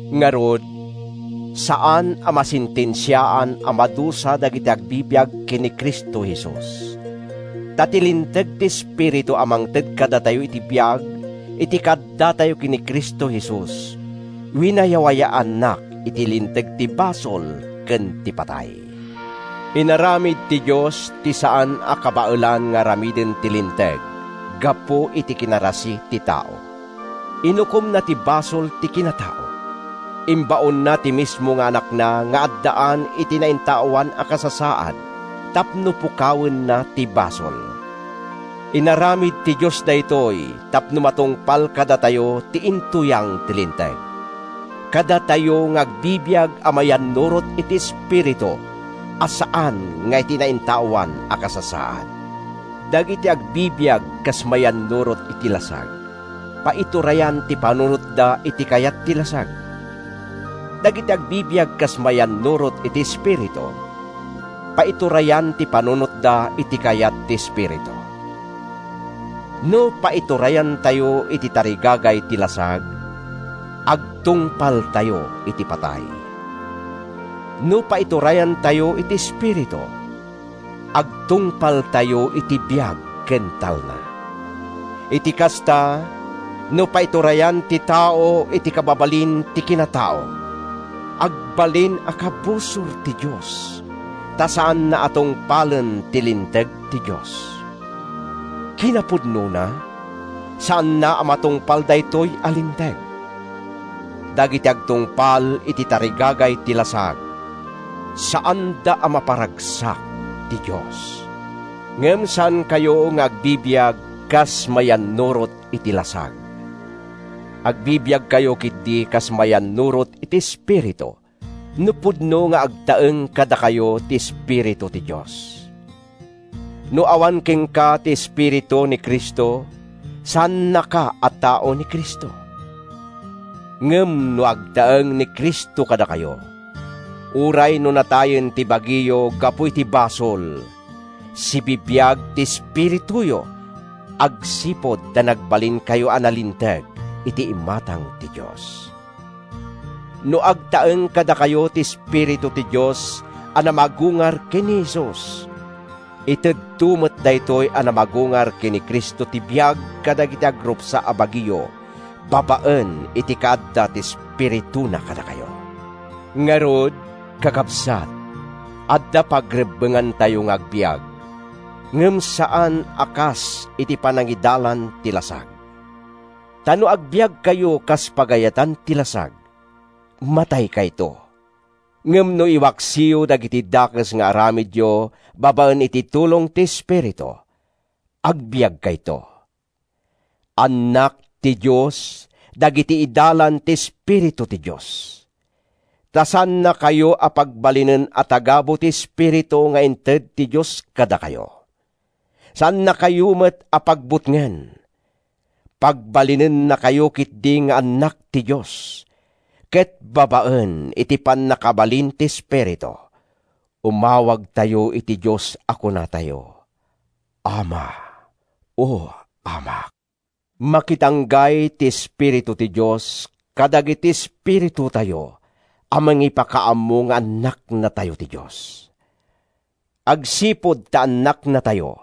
Ngarud, saan a masentensiaan a madusa dagiti agbibiag ken ni Cristo Jesus. Ta ti linteg ti Espiritu a mangted kadatayo iti biag iti kaaddatayo ken ni Cristo Jesus, winayawayaannak iti linteg ti basol ken ti patay. Inaramid ti Dios ti saan a kabaelan nga aramiden ti Linteg gapu iti kinarasi ti tao. Inukomna ti basol ti kinatao. Imbaonna ti mismo nga Anakna nga addaan iti naintaoan a kasasaad tapno pukawenna ti basol. Inaramid ti Dios daytoy tapno matungpal kadatayo ti intuyang ti Linteg—kadatayo nga agbibiag a mayannurot iti Espiritu a saan nga iti naintaoan a kasasaad. Dagiti agbibiag kas mayannurot iti lasag, paiturayan ti panunotda iti kayat ti lasag. Dagiti agbibiag kas mayannurot iti Espiritu, paiturayan ti panunotda iti kayat ti Espiritu. No paiturayantayo iti tarigagay ti lasag, agtungpaltayo iti patay. No paiturayantayo iti Espiritu, agtungpaltayo iti biag ken talna. Iti kasta, no paiturayan ti tao iti kababalin ti kinatao, agbalin a kabusor ti Dios, ta saanna a tungpalen ti linteg ti Dios. Kinapudnona, saanna a matungpal daytoy a linteg. Dagiti agtungpal iti tarigagay ti lasag, saanda a maparagsak ti Dios. Ngem saankayo nga agbibiag kas mayannurot iti lasag. Agbibiagkayo ketdi kas mayannurot iti Espiritu—no pudno nga agtaeng kadakayo ti Espiritu ti Dios. No awan kenka ti Espiritu ni Cristo, saannaka a tao ni Cristo. Ngem no agtaeng ni Cristo kadakayo, uray no natayen ti bagiyo gapu iti basol, sibibiag ti espirituyo agsipud ta nagbalinkayo a nalinteg iti imatang ti Dios. No agtaeng kadakayo ti Espiritu ti Dios a namagungar ken ni Jesus, itedto met daytoy a namagungar ken ni Cristo ti biag kadagiti agrupsa a bagiyo babaen iti kaadda ti Espirituna kadakayo. Ngarud, kakabsat, adda pagrebbengantayo nga agbiag, ngem saan a kas iti panangidalan ti lasag. Ta no agbiagkayo kas pagayatan ti lasag, mataykayto. Ngem no iwaksiyo dagiti dakes nga aramidyo babaen iti tulong ti Espiritu, agbiagkayto. Annak ti Dios dagiti idalan ti Espiritu ti Dios. Ta saannakayo a pagbalinen a tagabu ti Espiritu nga inted ti Dios kadakayo. Saannakayo met a pagbutngen. Pagbalinennakayo ketdi nga annak ti Dios, ket babaen iti pannakabalin ti Espiritu, umawagtayo iti Dios a kunatayo, “Ama, O Amak!” Makidanggay ti Espiritu ti Dios kadagiti espiritutayo a mangipakaammo nga annaknatayo ti Dios. Agsipud ta annaknatayo,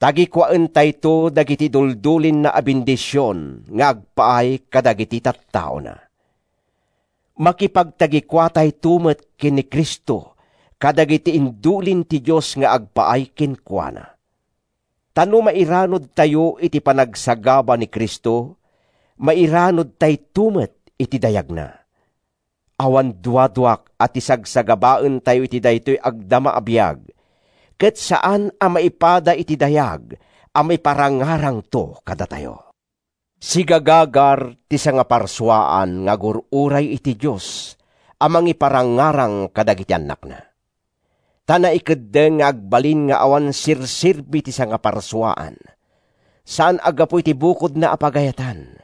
tagikuaentayto dagiti iduldulinna a bendision nga agpaay kadagiti tattaona. Makipagtagikuatayto met ken ni Cristo kadagiti indulin ti Dios nga agpaay kenkuana. Ta no mairanudtayo iti panagsagaba ni Cristo, mairanudtayto met iti dayagna. Awan duaduak a ti sagsagabaentayo iti daytoy agdama a biag ket saan a maipada iti dayag a maiparangarangto kadatayo. Sigagagar ti sangaparsuaan nga agur-uray iti Dios a mangiparangarang kadagiti annakna. Ta naikeddeng nga agbalin nga awan serserbi ti sangaparsuaan, saan a gapu iti bukodna a pagayatan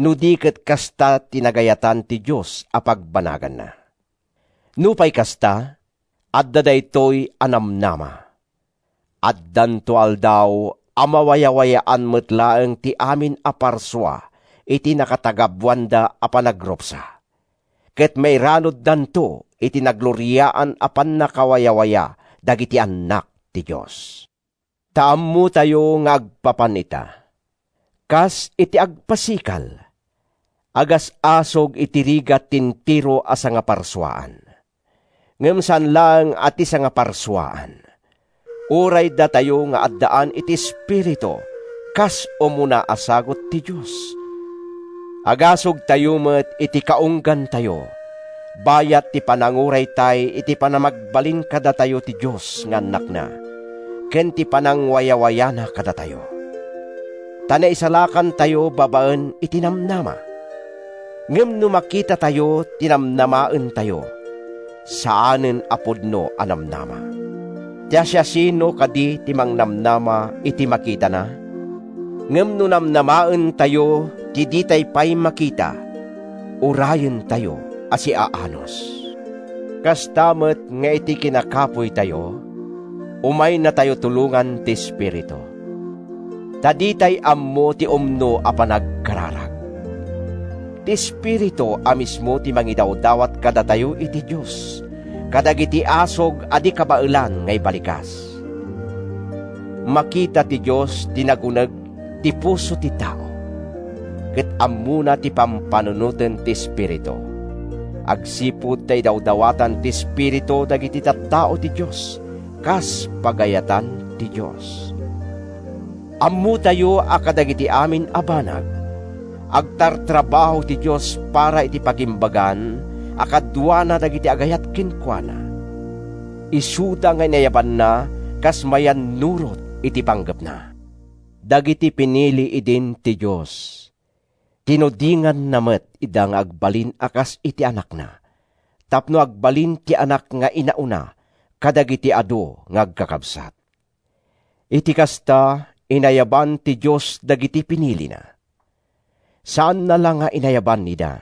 no di ket kasta ti nagayatan ti Dios a pagbanaganna. Nupay kasta, adda daytoy a namnama: Addanto aldaw a mawayawayaan met laeng ti amin a parsua iti nakatagabuanda a panagrupsa, ket mairanuddanto iti nagloriaan a pannakawayawaya dagiti annak ti Dios. Ta ammotayo nga agpapan ita, kas iti agpasikal, agas-asug iti rigat ti entero a sangaparsuaan. Ngem saan laeng a ti sangaparsuaan. Uray datayo nga addaan iti Espiritu kas umuna a sagut ti Dios, agasugtayo met iti kaunggantayo bayat ti pananguraytay iti panamagbalin kadatayo ti Dios nga annakna ken iti panangwayawayana kadatayo. Ta naisalakantayo babaen iti namnama. Ngem no makitatayo ti namnamaentayo, saanen a pudno a namnama. Ta siasino kadi ti mangnamnama iti makitana? Ngem no namnamaentayo ti ditay pay makita, urayentayo a siaanus. Kasta met nga iti kinakapuytayo, umaynatayo tulongan ti Espiritu. Ta ditay ammo ti umno a panagkararag. Ti Espiritu a mismo ti mangidawdawat kadatayo iti Dios kadagiti asug a di kabaelan nga ibalikas. Makita ti Dios ti naguneg ti puso ti tao, ket ammona ti pampanunoten ti Espiritu, agsipud ta idawdawatan ti Espiritu dagiti tattao ti Dios kas pagayatan ti Dios. Ammotayo a kadagiti amin a banag, agtartrabaho ti Dios para iti pagimbagan a kaduana dagiti agayat kenkuana, isuda nga inayabanna kas mayannurot iti panggepna. Dagiti pinili idin ti Dios, tinudinganna met ida nga agbalin a kas iti Anakna tapno agbalin ti Anak nga inauna kadagiti adu nga agkakabsat. Iti kasta, inayaban ti Dios dagiti pinilina. Saanna la nga inayaban ida,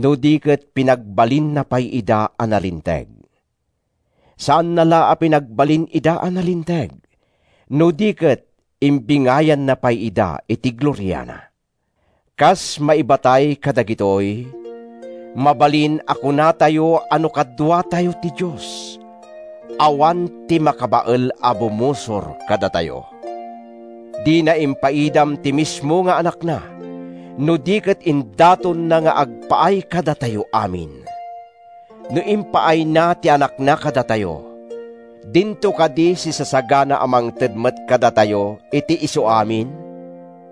no di ket pinagbalinna pay ida a nalinteg. Saanna la a pinagbalin ida a nalinteg, no di ket imbingayanna pay ida iti gloriana. Kas maibatay kadagitoy, mabalin a kunatayo a no kaduatayo ti Dios, awan ti makabael a bumusor kadatayo! Dina impaidam ti mismo nga Anakna, no di ket indatonna nga agpaay kadatayo amin! No impaayna ti Anakna kadatayo, dinto kadi sisasagana a mangted met kadatayo iti isuamin?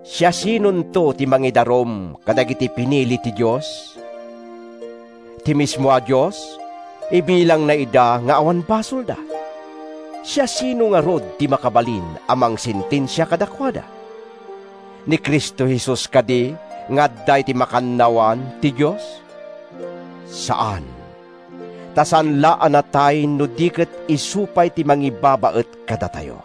Siasinonto ti mangidarum kadagiti pinili ti Dios? Ti mismo a Dios, ibilangna ida nga awan basolda! Siasino ngarud ti makabalin a mangsentensia kadakuada? Ni Cristo Jesus kadi nga adda iti makannawan ti Dios? Saan! Ta saan la a natay no di ket isu pay ti mangibabaet kadatayo.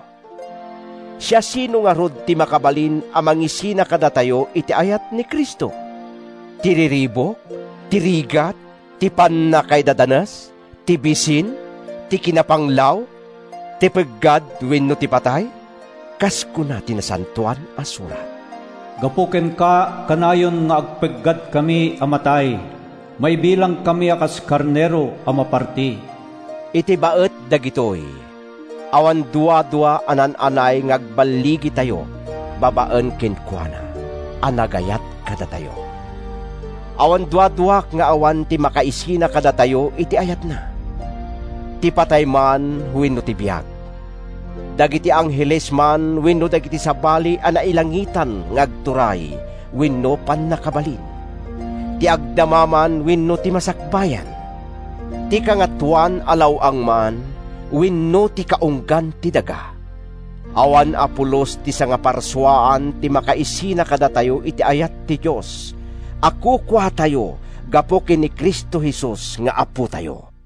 Siasino ngarud ti makabalin a mangisina kadatayo iti ayat ni Cristo? Ti riribuk? Ti rigat? Ti pannakaidadanes? Ti bisin? Ti kinapanglaw? Ti peggad wenno ti patay? Kas kuna ti Nasantoan a Surat, “Gapu kenka, kanayon nga agpeggadkami a matay, Maibilangkami a kas karnero a maparti.” Iti baet dagitoy, awan duadua a naan-anay nga agballigitayo babaen kenkuana a nagayat kadatayo! Awan duaduak nga awan ti makaisina kadatayo iti ayatna: ti patay man wenno ti biag, dagiti angheles man wenno dagiti sabali a nailangitan nga agturay wenno pannakabalin, ti agdama man wenno ti masakbayan, ti kangatoan a law-ang man wenno ti kaunggan ti daga. Awan a pulos iti sangaparsuaan ti makaisina kadatayo iti ayat ti Dios a kukuatayo gapu ken ni Cristo Jesus nga Apotayo!